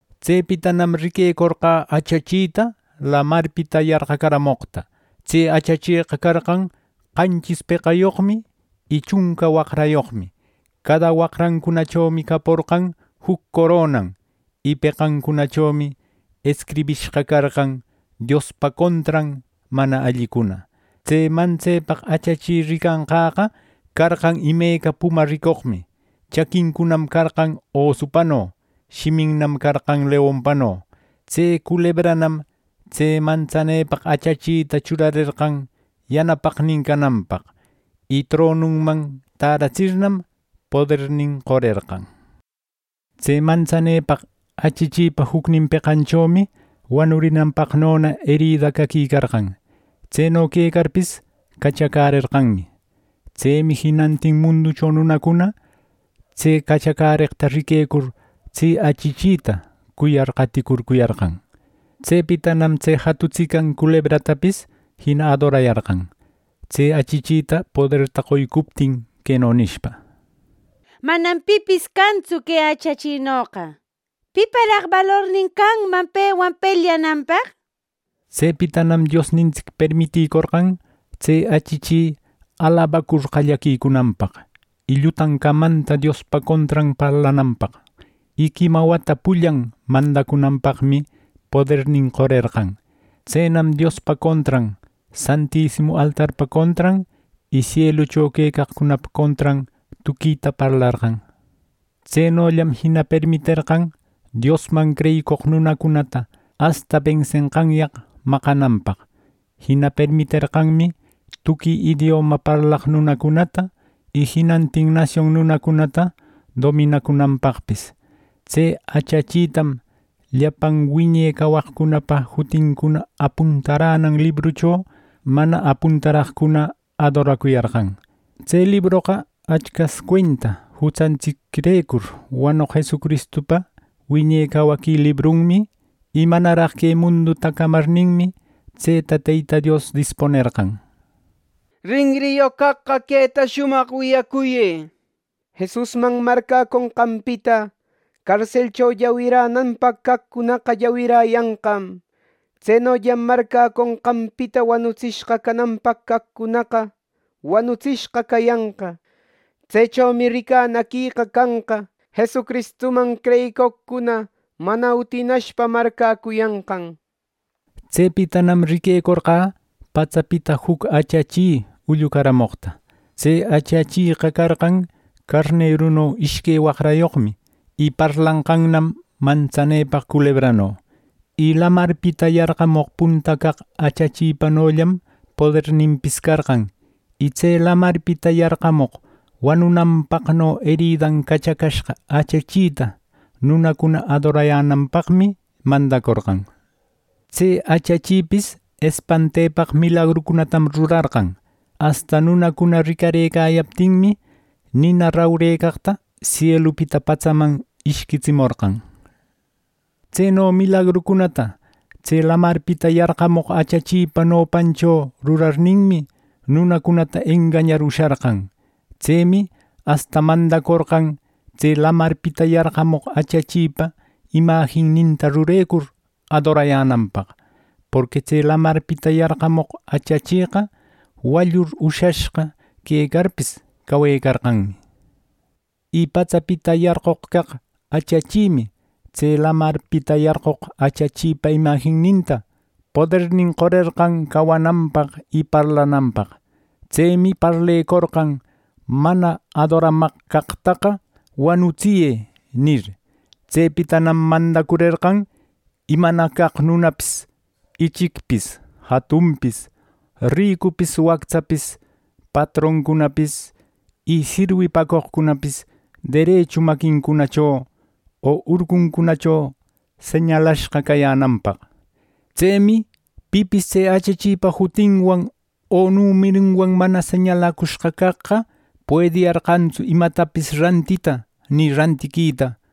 Tsepitanam riquecorqä achachita lamarpita yarqacaramoqta. Tse achacheqa carqan qanchis peqayoqmi y chunca wacrayoqmi. Cada waqrancunachomi caporqan juc coronan, y peqancunachomi escribishqa carqan Diospa contran mana allicuna. Tse mantsepaq achachi ricanqäqa carqan imeca puma ricoqmi. Chaquincunam carqan osupano. Shiminnam carqan leonpano. Tse culebranam tse mantsanepaq achachita churarerqan yanapaqnin cananpaq. Y tronunman täratsirnam, podernin qorerqan. Tse mantsanepaq achachipa jucnin peqanchomi wanurinanpaqnona erida caquicarqan. Tseno quecarpis cachacärerqanmi. Tsemi jinantin munducho nunacuna tse cachacäreqta riquecur, tse achachita cuyar qaticurcuyarqan. Tsepitanam tse jatutsican culebratapis jina adorayarqan tse achachita poderta qoycuptin queno nishpa: “Manam pipis cantsu que achachinoqa. ¿Piparaq balornin canman pewan pelyananpaq?” nishpa. Tsepitanam Diosnintsic permiticorqan tse achachi alabacur qallaquicunanpaq, y llutan camanta Diospa contran parlananpaq; y quima wata pullan mandacunanpaqmi podernin qorerqan. Tsenam Diospa contran, santisimu altarpa contran, y sielucho quecaqcunapa contran tuquita parlarqan. Tsenollam jina permiterqan Diosman creyicoq nunacunata asta bensenqanyaq maqananpaq. Jina permiterqanmi tuqui idioma parlaq nunacunata, y jinantin nasion nunacunata dominacunanpaqpis. Tse achachitam llapan wiñe cawaqcunapa jutincuna apuntaränan librucho mana apuntaraqcuna adoracuyarqan. Tse libroqa Achcas cuenta jutsantsicrecur wanoq Jesucristupa wiñe cawaqui librunmi, y manaraq que munduta camarninmi, tseta Teyta Dios dispunerqan. Rinriyoq caqqa queta shumaq wiyacuyë. “Jesusman marcäconqanpita carselcho llawiränanpaq caqcunaqa, llawiräyanqam. Tsenollam marcäconqanpita wanutsishqa cananpaq caqcunaqa, wanutsishqa cayanqa. Tsechomi ricanaquïqa canqa Jesucristuman creyicoqcuna mana utinashpa marcäcuyanqan.” Tsepitanam riquecorqä patsapita juc achachi ullucaramoqta. Tse achacheqa carqan carneruno ishque waqrayoqmi, y parlarqannam mantsanepaq culebrano. Y lamarpita yarqamoq punta caq achachipanollam poderninpis carqan. Y tse lamarpita yarqamoq wanunanpaqno eridan cachacashqa achachita nunacuna adorayänanpaqmi mandacorqan. Tse achachipis espantepaq milagrucunatam rurarqan; asta nunacuna ricarëcayaptinmi, nina rupecaqta sielupita patsaman ishquitsimorqan. Tseno milagrucunata tse lamarpita yarqamoq achachipa nopancho rurarninmi nunacunata engañar usharqan. Tsemi asta mandacorqan tse lamarpita yarqamoq achachipa imajinninta rurecur adorayänanpaq; porqui tse lamarpita yarqamoq achacheqa wallur ushashqa quecarpis cawecarqanmi. Y patsapita yarqoq caq achachimi tse lamarpita yarqoq achachipa imajininta podernin qorerqan cawananpaq y parlananpaq. Tsemi parlecorqan: “¡Mana adoramaq caqtaqa wanutsiyë!” nir. Tsepitanam mandacurerqan imana caq nunapis ichicpis, jatunpis, ricupis, wactsapis, patroncunapis y sirwipäcoqcunapis, derechu maquincunacho o urcuncunacho señalashqa cayänanpaq. Tsemi pipis tse achachipa jutinwan o numerunwan mana señalacushqa caqqa puediyarqantsu imatapis rantita ni rantiquita.